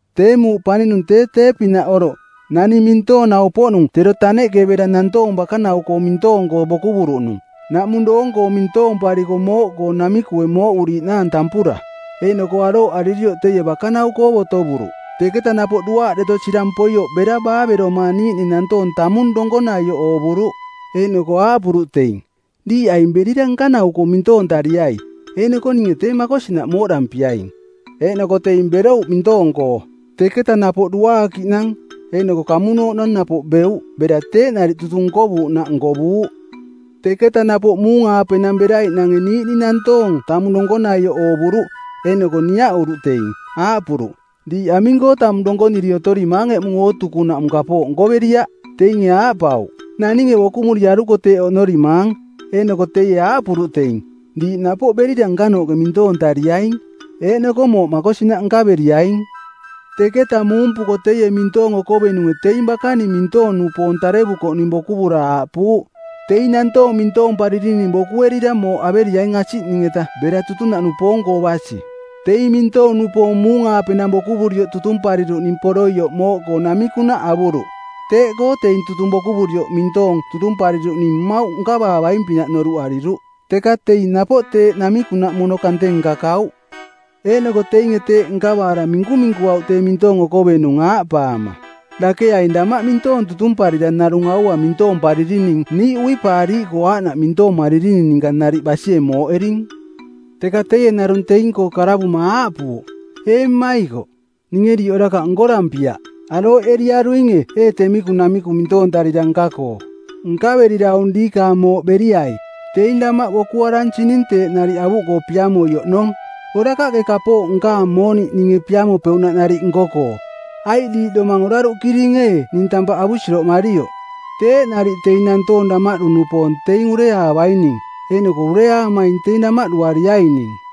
“Tee muuꞌ paninung tee tee-pinaꞌ oroꞌ, naning mintoonau-poꞌnung tero taneꞌke bera nantoong bakanau-koo mintoong-koo bokuvuruꞌnung, naꞌmung doong-koo mintoompariko mooꞌkoo namikue mooꞌuriiꞌnaang tampura; Eeꞌnoko arooꞌaririoꞌ teie bakanau-koo botovuruꞌ. Teketa napoꞌ duaaꞌ deto sirang poioꞌ bera baaveromaa niiꞌning nantoong tamung donkonaioꞌ oovuruꞌ. Eeꞌnoko aaꞌpuruꞌ teing, ‘Diiꞌ aing berira nkanau-koo mintoontariai, eeꞌnoko ninge tee makosinaꞌ mooꞌdampiaing.’ Eeꞌnoko teing berouꞌ mintoong-koo. Teketa napoꞌ duaakiꞌnang eeꞌnoko kamunooꞌnang napoꞌ beuꞌ bera teeꞌ nariꞌ tutung nkovuuꞌnaꞌ nkovuuꞌ. Teketa napoꞌ muung-aapenang beraiꞌnange niiꞌning nantoong tamung donkonaioꞌ oovuruꞌ, eeꞌnoko niaꞌuruꞌ teing, aaꞌpuruꞌ, ‘Diiꞌ aming-koo tamung donkoniri otorimaang eꞌmung ootukunaꞌmung kapooꞌ nkoveriaꞌ?’ Teinge aaꞌpauꞌ, ‘Naninge bokumuriaruko teeꞌ oꞌnorimaang.’ Eeꞌnoko teie aaꞌpuruꞌ teing, ‘Diiꞌ napoꞌ berira nkanooꞌke mintoontariaing, eeꞌnoko mooꞌ makosinaꞌ nkaveriaing.’ “Teketa muumpuko teie mintoong okovenunge teing bakaning mintoong-nupoong tarevurikoꞌning bokuvura aaꞌpuuꞌ, ‘Teing nantoong mintoomparirining bokuerira mooꞌ averiaing asiꞌning-eta bera tutunaꞌnupoong-koo basi.’ Teing mintoong-nupoong muung-aapenang bokuvurioꞌ tutumpariruꞌning poroioꞌ mooꞌkoo namikunaꞌ avuruꞌ. Teeꞌkoo teing tutung bokuvurioꞌ mintoong tutumpariruꞌning mmauꞌ nkavaavaing-pinaꞌ noruꞌariruꞌ, teka teing napoꞌ teeꞌ namikunaꞌ mono kante nkakauꞌ. Eeꞌnoko teinge teeꞌ nkavaara minkuminkuauꞌ tee mintoong okovenung, aaꞌpaama, ‘Dake aing damaꞌ mintoong tutumparira narung aua mintoomparirining niiꞌ uipaariiꞌkoo aaꞌnaꞌ mintoomaririning ninka nariꞌ basie mooꞌering.’ Teka teie narung teing-koo karavuma aaꞌpuuꞌ, ‘Ee mmaikoꞌ, ninge diiꞌ orakaꞌ nkorampiaꞌ. Arooꞌeriaruinge ee temiku namiku mintoontarira nka-koo? Nkaverira aung diikaang mooꞌ beriai. Teing damaꞌ bokuaransing teeꞌ nariꞌ avuꞌkoo piamoi oꞌnong. Orakaꞌke kapooꞌ nkaang mooniꞌ ninge piamopeuꞌnaꞌ nariꞌ nko-koo? Aiꞌ diiꞌ domang oraruꞌkiring ee ning tampaꞌ avusiroꞌmarioꞌ?’ Teeꞌ nariꞌ teing nantoong damaꞌdu-nupoong teing ureaavaining, eeꞌnoko ureaamaing teing damaꞌduariaining.”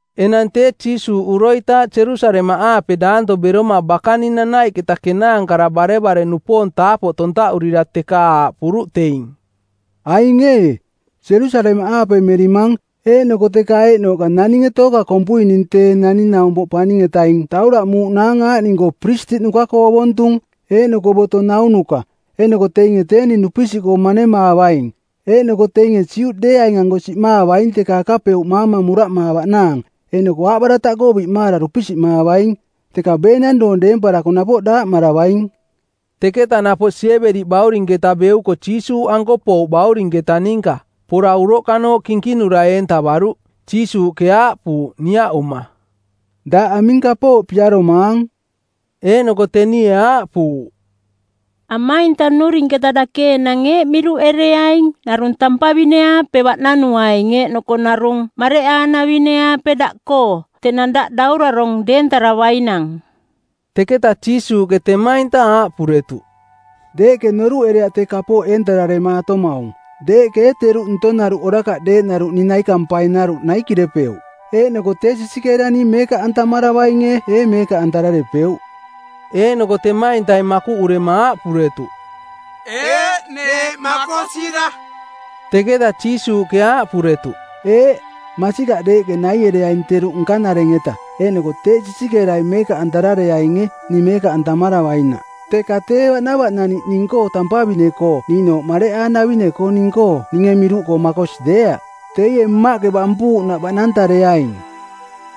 Enang tee Jiisuuꞌ uroitaaꞌ Jerusalemaꞌaape daanto beroma bakaning nanaiꞌketa kenaankara barevare-nupoong taapoꞌ tontaꞌurira teka aaꞌpuruꞌ teing, “Aing ee, Jerusalemaꞌaape merimang eeꞌnoko teka eeꞌnooꞌka naninge tooka kompui ning Tee Naning-naumpoꞌ Paning-etaing tauraꞌmuuꞌnaang aaꞌning-koo Piristiꞌnuka-koo ovontung eeꞌnoko boto naunuka, eeꞌnoko teinge tee ning dupisiꞌkoo manemaavaing. Eeꞌnoko teinge Juꞌdeeaing-anko siꞌmaavaing teka akapeuꞌmaama muraꞌmaavaꞌnaang, eeꞌnoko aaꞌbarataꞌkoo biꞌmaara dupisiꞌmaavaing. Teketa beenang doong deemparako napoꞌ daaꞌmaravaing.” Teketa napoꞌ Siebedi baurinketa beuko Jiisuuꞌanko pouꞌ baurinketa ninka. Pora uroꞌkanooꞌ kinkinura eentavaruꞌ. Jiisuuꞌke aaꞌpuuꞌ, niaꞌuma, “Daꞌ aming kapooꞌ piaromaang?” Eeꞌnoko tenie aaꞌpuuꞌ, “Amainta nnurinketa dake enang eeꞌ miruꞌereaing narung tampavine-aape baꞌnanuaing eeꞌnoko narung mareꞌaanavine-aape daꞌkoo tenang daꞌ daurarong deentaravainang.” Teketa Jiisuuꞌke temainta aaꞌpuretuꞌ, “Deeꞌke noruꞌereaꞌ tee kapooꞌ eentameremaatomaung. Deeꞌke ee teruꞌ ntonaruꞌ orakaꞌ deeꞌnaruꞌ ning naikampainaruꞌ naikirepeuꞌ? Eeꞌnoko tee sisikeera ning meekaꞌantamaravainge ee meekaꞌantararepeuꞌ?” Eeꞌnoko temaintai makuꞌurema aaꞌpuretuꞌ, “Eeꞌ, neeꞌ makosira.” Teketa Jiisuuꞌke aaꞌpuretuꞌ, “Eeꞌ, masikaꞌ deeꞌke naiereaing teruꞌ nkanareng-eta, eeꞌnoko teeꞌ sisikeerai meekaꞌantarareainge ning meekaꞌantamaravainaꞌ, teka tee baꞌnavaꞌnaniꞌ ning-koo tampavine-koo niiꞌnooꞌ mareꞌaanavine-koo ning-koo ninge miruꞌkoo makosi deeaꞌ. Teie Mmaꞌke bampuuꞌnaꞌ baꞌnantareaing.”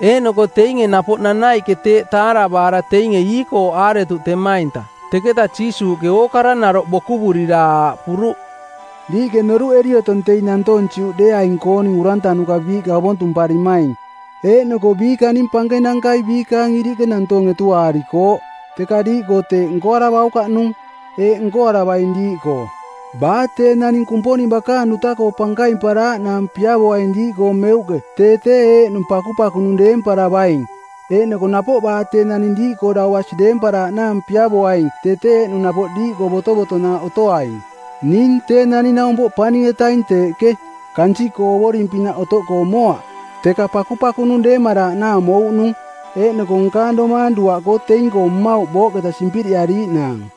Eeꞌnoko teinge napoꞌ nanaiꞌke teeꞌ taaravaara teinge iikooꞌaaretuꞌ temainta. Teketa Jiisuuꞌke ookara naroꞌ bokuvurira aaꞌpuruꞌ, “Diiꞌke noruꞌeri otong teing nantoong Juꞌdeeaing-kooning urantanuka biiꞌka ovontumparimaing eeꞌnoko biikaning pankenankai biikaang iriꞌke nantoong etuaarikooꞌ. Teka diiꞌkoo teeꞌ nkoaravaukaꞌnung. Eeꞌ nkoaravaing diiꞌkoo: baa tee naning Kumponing bakaang duta-koo pankaimparaaꞌnaang piavoaing diiꞌkoo meuꞌke tee tee eeꞌnung pakupakunung deemparavaing. Eeꞌnoko napoꞌ baa tee naning diiꞌkoo dau basi deemparaaꞌnaang piavoaing tee tee eeꞌnung napoꞌ diiꞌkoo botovotonaaꞌ otoaing. Ning Tee Naning-naumpoꞌ Paning-etaing teeꞌke, kansiꞌkoo ovoring-pinaꞌ otoꞌkoo moaꞌ, teka pakupakunung deemaraaꞌnaang mouꞌnung, eeꞌnoko nkaang domaang duaꞌkoo teing-koo mmauꞌ booꞌketa simpiriꞌariiꞌnaang.”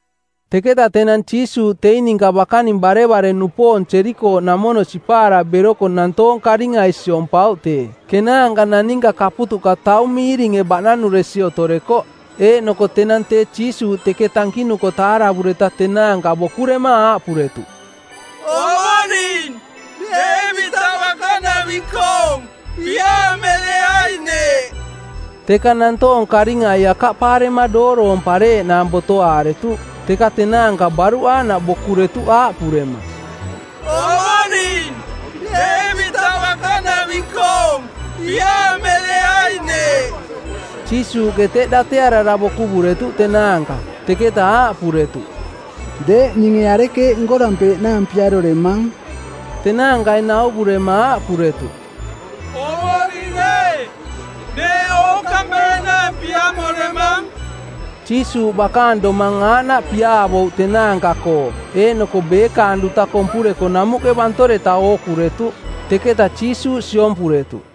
Teketa tenang Jiisuuꞌ teing ninka bakaning barevare-nupoong Jerikooꞌnamono sipaara beroko nantoong karingai siompauꞌ tee. Kenaanka naninka kaputuꞌka taung miiringe baꞌnanuresi otorekoꞌ, eeꞌnoko tenang tee Jiisuuꞌ teketa tankinuko taaravureta tenaanka bokurema aaꞌpuretuꞌ, “Ovoring, Deevitaꞌ bakanaving-koong, piaamereai neeꞌ.” Teka nantoong karingai akaꞌpaarema dooroompareeꞌnaang botoaaretuꞌ. Teka tenaanka baruꞌ aaꞌnaꞌ bokuretuꞌ aaꞌpurema, “Ovoring, Deevitaꞌ bakanaving-koong, piaamereai neeꞌ.” Jiisuuꞌke teꞌ datearara bokuvuretuꞌ tenaanka, teketa aaꞌpuretuꞌ, “Deeꞌ ninge arekeeꞌ nkorampeeꞌnaang piaroremang?” Tenaankai nauvurema aaꞌpuretuꞌ, “Ovoring ee, neeꞌ ookampeeꞌnaang piamoremang.” Jiisuuꞌ bakaang domang aaꞌnaꞌ piaavouꞌ tenaanka-koo, eeꞌnoko beekaang duta kompureko namuꞌke bantoreta ookuretuꞌ. Teketa Jiisuuꞌ siompuretuꞌ.